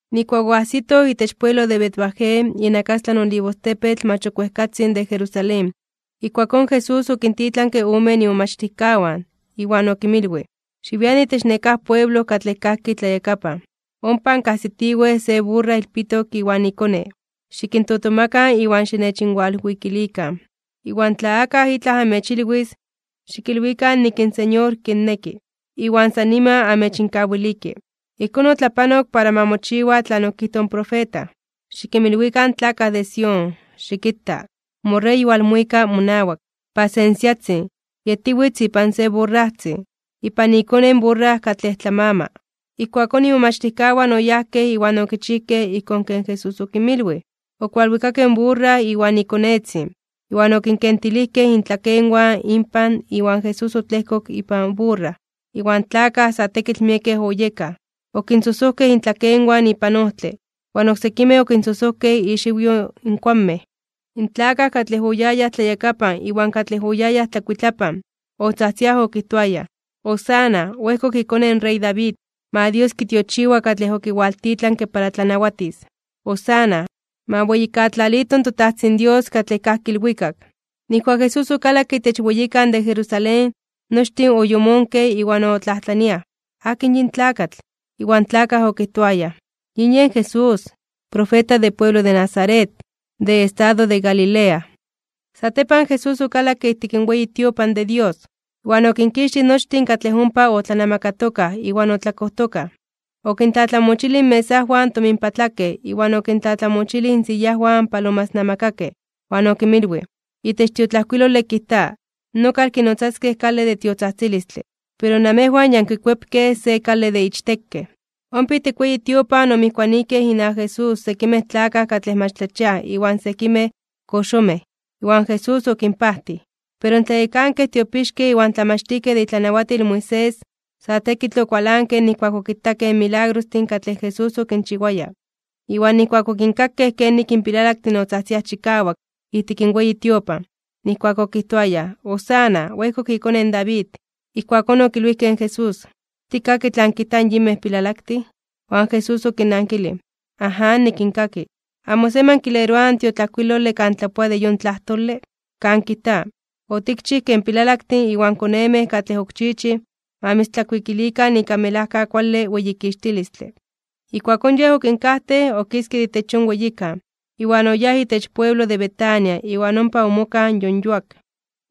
Nijkuak oajsitoj itech pueblo de Betfagé, inakastlan Olivostepetl mach ok wejkatzin de Jerusalén, ijkuakón Jesús okintitlanke omen imomachtijkawan iwan okinmilwij: ―Xiwian itech nekáj pueblo katlej kajki tlayakapan. Ompa ankajsitiwej se burra ilpitok iwan ikone. Xikintotomakan iwan xinechinwalwikilikan. Iwan tla akaj itlaj amechilwis, xikilwikan nik in Señor kinneki, iwan san niman amechinkawiliki. Ijkón otlapanok para ma mochiwa tlan okijtoj in profeta: Xikinmilwikan in tlakaj de Sión: “Xikita, moRey walmuika monawak, pasensiatzin, yetiwitz ipan se burrajtzin, ipan ikone in burra katlej tlamama.” Ijkuakón imomachtijkawan oyajkej iwan okichijkej ijkón ken Jesús okinmilwij. Okualwikakej in burra iwan ikonetzin, iwan okinkentilijkej intlakenwan inpan iwan Jesús otlejkok ipan burra. Iwan tlakaj, sa tekitl miekej oyekaj, okinsojsojkej intlakenwan ipan ojtle, iwan oksekimej okisojsojkej ixiwyo in kuanmej. In tlakaj katlej oyayaj tlayakapan iwan katlej oyayaj tlakuitlapan, otzajtziaj okijtoayaj: ―¡Hosana! ¡Oejkok iKone in rey David! ¡Ma Dios kitiochiwa katlej okiwaltitlanke para tlanawatis! ¡Hosana! ¡Ma weyijkatlalito in toTajtzin Dios katlej kajki ilwikak! Nijkuak Jesús okalakke itech weyikan de Jerusalén, nochtin oyomonkej iwan otlajtlaniaj: ―¿Akin yin tlakatl? Iwan tlakaj okijtoayaj: ―Yin yen Jesús, in profeta de pueblo de Nazaret, de estado de Galilea. Satepan Jesús okalakke ijtik weyi tiopan de Dios, iwan okinkixtij nochtin katlej ompa otlanamakatokaj iwan otlakojtokaj. Okintlatlamochilij inmesajwan in tominpatlakej, iwan okintlatlamochilij insiyajwan in palomasnamakakej. Iwan okinmilwij: ―Itech tiotlajkuilole kijta: “Nokal kinotzaskej kale de tiotzajtzilistle”, pero namejwan ya ankikuepkej se kale de ichtekej. Ompa ijtik in weyi tiopan omijkuanijkej inawak Jesús sekimej tlakaj katlej mach tlachiaj iwan sekimej koxomej, iwan Jesús okinpajtij. Pero in tlayekankej tiopixkej iwan tlamachtijkej de itlanawatil in Moisés, sa tekitl okualankej nijkuak okitakej in milagrostin katlej Jesús okinchiwaya, iwan nijkuak okinkakej kenik in pilalaktin otzajtziaj chikawak ijtik in weyi tiopan, nijkuak okijtoayaj: “¡Hosana! ¡Oejkok iKone in David!” Ijkuakón okilwijkej in Jesús: ―¿Tikkaki tlan kijtaj in yinmej pilalaktin? Iwan Jesús okinnankilij: ―Aján, nikinkaki. ¿Amo semi ankileroaj in tiotlajkuilole kan tlapoa de yon tlajtole? Kan kijta: Otikchij ke in pilalaktin iwan konemej katlej ok chiichij, ma mitztlakuikilikan ika melajka kuale weyikixtilistle. Ijkuakón Yej okinkajtej, okiske de itech yon weyikan, iwan oyáj itech pueblo de Betania iwan ompa omokaj yon yuak.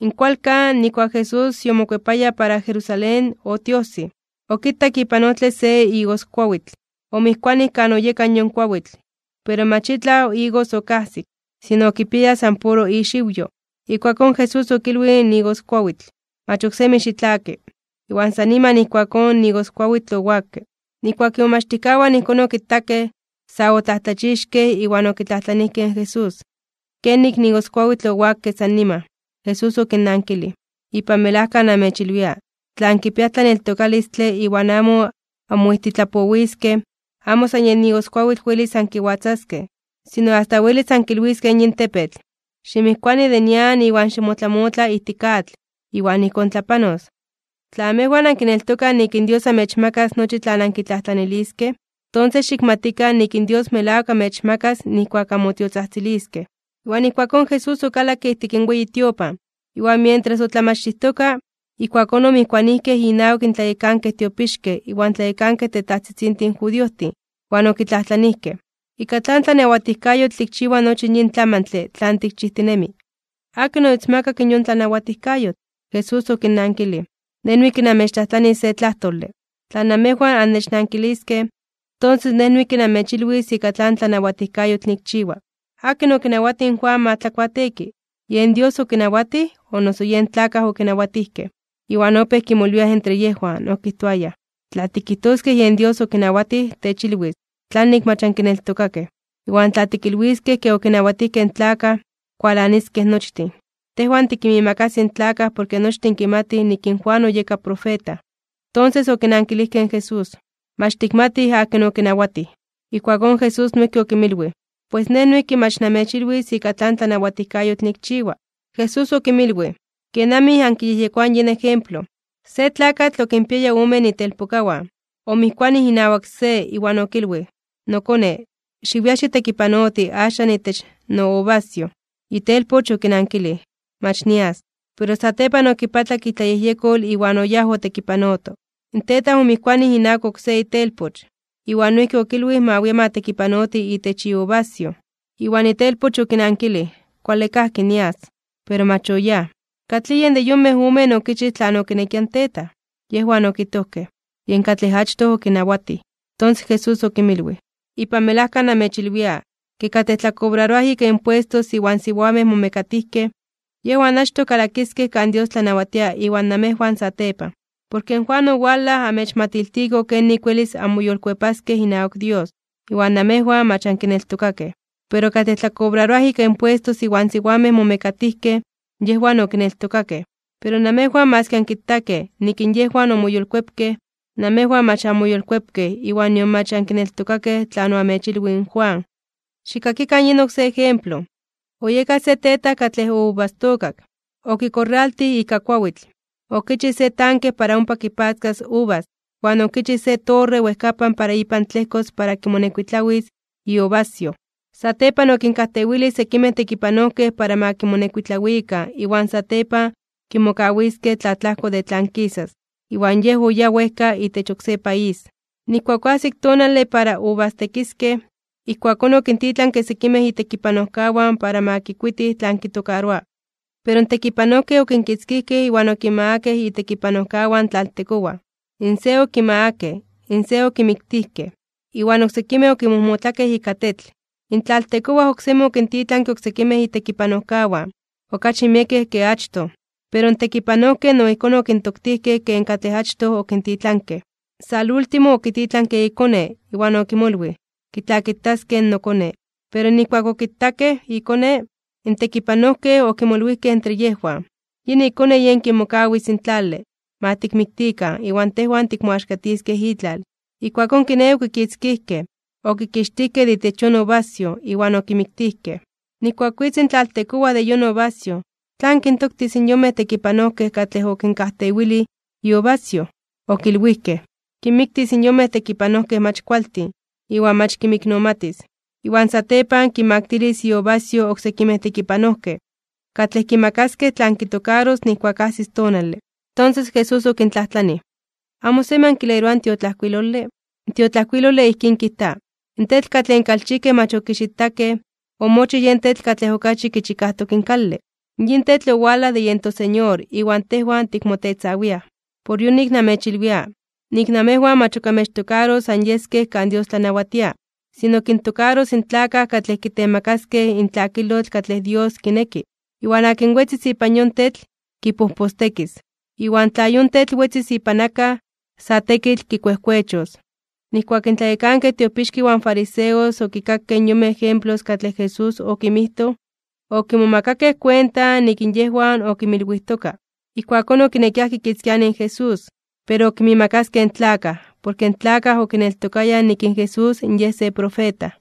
In kualkan, nijkuak Jesús yomokuepaya para Jerusalén, otiojsij. Okitak ipan ojtle se igoskuawitl, omijkuanij kan oyeka yon kuawitl, pero mach itlaj igos okajsik, sino okipiaya san puro ixiwyo. Ijkuakón, Jesús okilwij in igoskuawitl: ―Mach ok semi xitlaki. Iwan san niman ijkuakón in igoskuawitl owakke. Nijkuak imomachtijkawan ijkón okitakej, sa otlajtlachixkej (omomajmawtijkej) iwan okitlajtlanijkej in Jesús: ―¿Kenik in igoskuawitl owakke san niman? Jesús okinnankilij: ―Ipan melajka namechilwia, tla ankipiaj tlaneltokalistle iwan amo anmoijtitlapowiskej, amo san yen igoskuawitl welis ankiwatzaskej, sino asta welis ankilwiskej yin tepetl: “Ximijkuani de nian iwan ximotlamotla ijtik atl”, iwan ijkón tlapanos. Tla amejwan ankineltokaj nik in Dios amechmakas nochi tlan ankitlajtlaniliskej, tonses xikmatikan nik in Dios melawak amechmakas nijkuak anmotiotzajtziliskej. Iwan ijkuakón Jesús okalakke ijtik in weyi tiopan, iwan mientras otlamachtijtoka, ijkuakón omijkuanijkej inawak in tlayekankej tiopixkej iwan tlayekankej tetajtzitzintin judiojtin, iwan okitlajtlanijkej: ―¿Ika tlan tlanawatijkayotl tikchiwa nochi yin tlamantle tlan tikchijtinemi? ¿Akin omitzmakak yon tlanawatijkayotl? Jesús okinnankilij: ―Nej noijki namechtlajtlanis se tlajtole, tla namejwan annechnankiliskej, tonses Nej noijki namechilwis ika tlan tlanawatijkayotl nikchiwa. ¿Akin okinawatij in Juan ma tlakuateeki? ¿Yen Dios okinawatij, o noso yen tlakaj okinawatijkej? Iwan opéj kimolwiaj entre yejwan, okijtoayaj: ―Tla tikijtoskej yen Dios okinawatij, techilwis: “¿Tlanik mach ankineltokakej?” Iwan tla tikilwiskej ke okinawatijkej in tlakaj, kualaniskej nochtin. Tejwan tikinmiimakasij in tlakaj porke nochtin kimatij nik in Juan oyeka profeta. Tonses okinankilijkej in Jesús: ―Mach tikmatij akin okinawatij. Ijkuakón Jesús noijki okinmilwij: ―Pues Nej noijki mach namechilwis ika tlan tlanawatijkayotl nikchiwa. Jesús okinmilwij: ―¿Kenamij ankiyejyekoaj yin ejemplo? Se tlakatl okinpiaya omen itelpokawan. Omijkuanij inawak se, iwan okilwij: “Nokone, xiwia xitekipanoti axan itech nouvasyoj.” Itelpoch okinankilij: “Mach nias.” Pero satepan okipatlak itlayejyekol iwan oyáj otekipanoto. In tetaj omijkuanij inawak oksé itelpoch, iwan noijki okilwij ma wia ma tekipanoti itech iuvasyoj, iwan itelpoch okinankilij: “Kuale kajki, nias.” Pero mach oyáj. ¿Katlij yen de yonmej omen okichij tlan okinekia in tetaj? Yejwan okijtojkej: ―Yen katlej achtoj okinawatij. Tonses in Jesús okinmilwij: ―Ipan melajka namechilwia, ke katlej tlakobraroaj ika impuestos iwan siwamej momekatijkej, yejwan achtoj kalakiskej kan Dios tlanawatia iwan namejwan satepan. Porke Juan owalaj oamechmatiltiko kenik welis anmoyolkuepaskej inawak Dios, iwan namejwan mach ankineltokakej. Pero katlej tlakobraroaj ika impuestos iwan siwamej momekatijkej, yejwan okineltokakej. Pero namejwan maski ankitakej nik in yejwan omoyolkuepkej, namejwan mach anmoyolkuepkej iwan nion mach ankineltokakej tlan oamechilwij in Juan. ’Xikkakikan yin oksé ejemplo: Oyeka se tetaj katlej ouvastookak. Okikorraltij ika kuawitl. Okichij se tanke para ompa kipatzkas uvas, iwan okichij se torre wejkapan para ipan tlejkos para kimonekuitlawis iuvasyoj. ’Satepan okinkajtewilij sekimej tekipanojkej para ma kimonekuitlawikan iwan satepan kimokawiskej tlaatlajko de tlan kisas, iwan yej oyáj wejka itech oksé país. Nijkuak oajsik in tonale para uvastekiskej, ijkuakón okintitlanke sekimej itekipanojkawan para ma kikuitij tlan kitokaroa. Pero in tekipanojkej okinkitzkijkej iwan okinmagakej itekipanojkawan in tlaltekowaj. In se okimagakej, in se okimiktijkej, iwan oksekimej okinmojmotlakej ika tetl. In tlaltekowaj oksemi okintitlanke oksekimej itekipanojkawan, okachi miekej ke achtoj. Pero in tekipanojkej no ijkón okintoktijkej ken katlej achtoj okintitlanke. ’Salúltimo okititlanke ikone, iwan okimolwij: “Kitlakitaskej in nokone.” Pero nijkuak okitakej ikone, in tekipanojkej okimolwijkej entre yejwan: “Yin ikone yen kimokawis in tlale. Ma tikmiktikan, iwan tejwan tikmoaxkatiskej itlal.” Ijkuakón kiné, okikitzkijkej, okikixtijkej de itech yon uvasyoj, iwan okimiktijkej. ’Nijkuak witz in tlaltekowaj de yon uvasyoj, ¿tlan kintoktis in yonmej tekipanojkej katlej okinkajtewilij iuvasyoj? Okilwijkej: ―Kinmiktis in yonmej tekipanojkej mach kualtin, iwan mach kinmiknomatis. Iwan satepan kinmaktilis iuvasyoj oksekimej tekipanojkej, katlej kimakaskej tlan kitokaros nijkuak ajsis tonale. Tonses Jesús okintlajtlanij: ―¿Amo semi ankileroaj in tiotlajkuilole? In tiotlajkuilole ijkín kijta: In tetl katlej in kalchijkej mach okixitakej, omochij yen tetl katlej okachi kichikajtok in kale. Yin tetl owalaj de yen toSeñor iwan tejwan tikmotetzawiaj. Por yonik namechilwia, nik namejwan mach ok amechtokaros anyeskej kan Dios tlanawatia, sino kintokaros in tlakaj katlej kitemakaskej in tlakilotl katlej Dios kineki. Iwan akin wetzis ipan yon tetl, kipojpostekis. Iwan tla yon tetl wetzis ipan akaj, sa tekitl kikuejkuechos. Nijkuak in tlayekankej tiopixkej iwan fariseos okinkakej yonmej ejemplos katlej Jesús okinmijtoj, okimomakakej kuenta nik yejwan okimilwijtoka. Ijkuakón okinekiaj kikitzkianij in Jesús, pero okinmiimakaskej in tlakaj, porke in tlakaj okineltokayaj nik in Jesús Yej se profeta.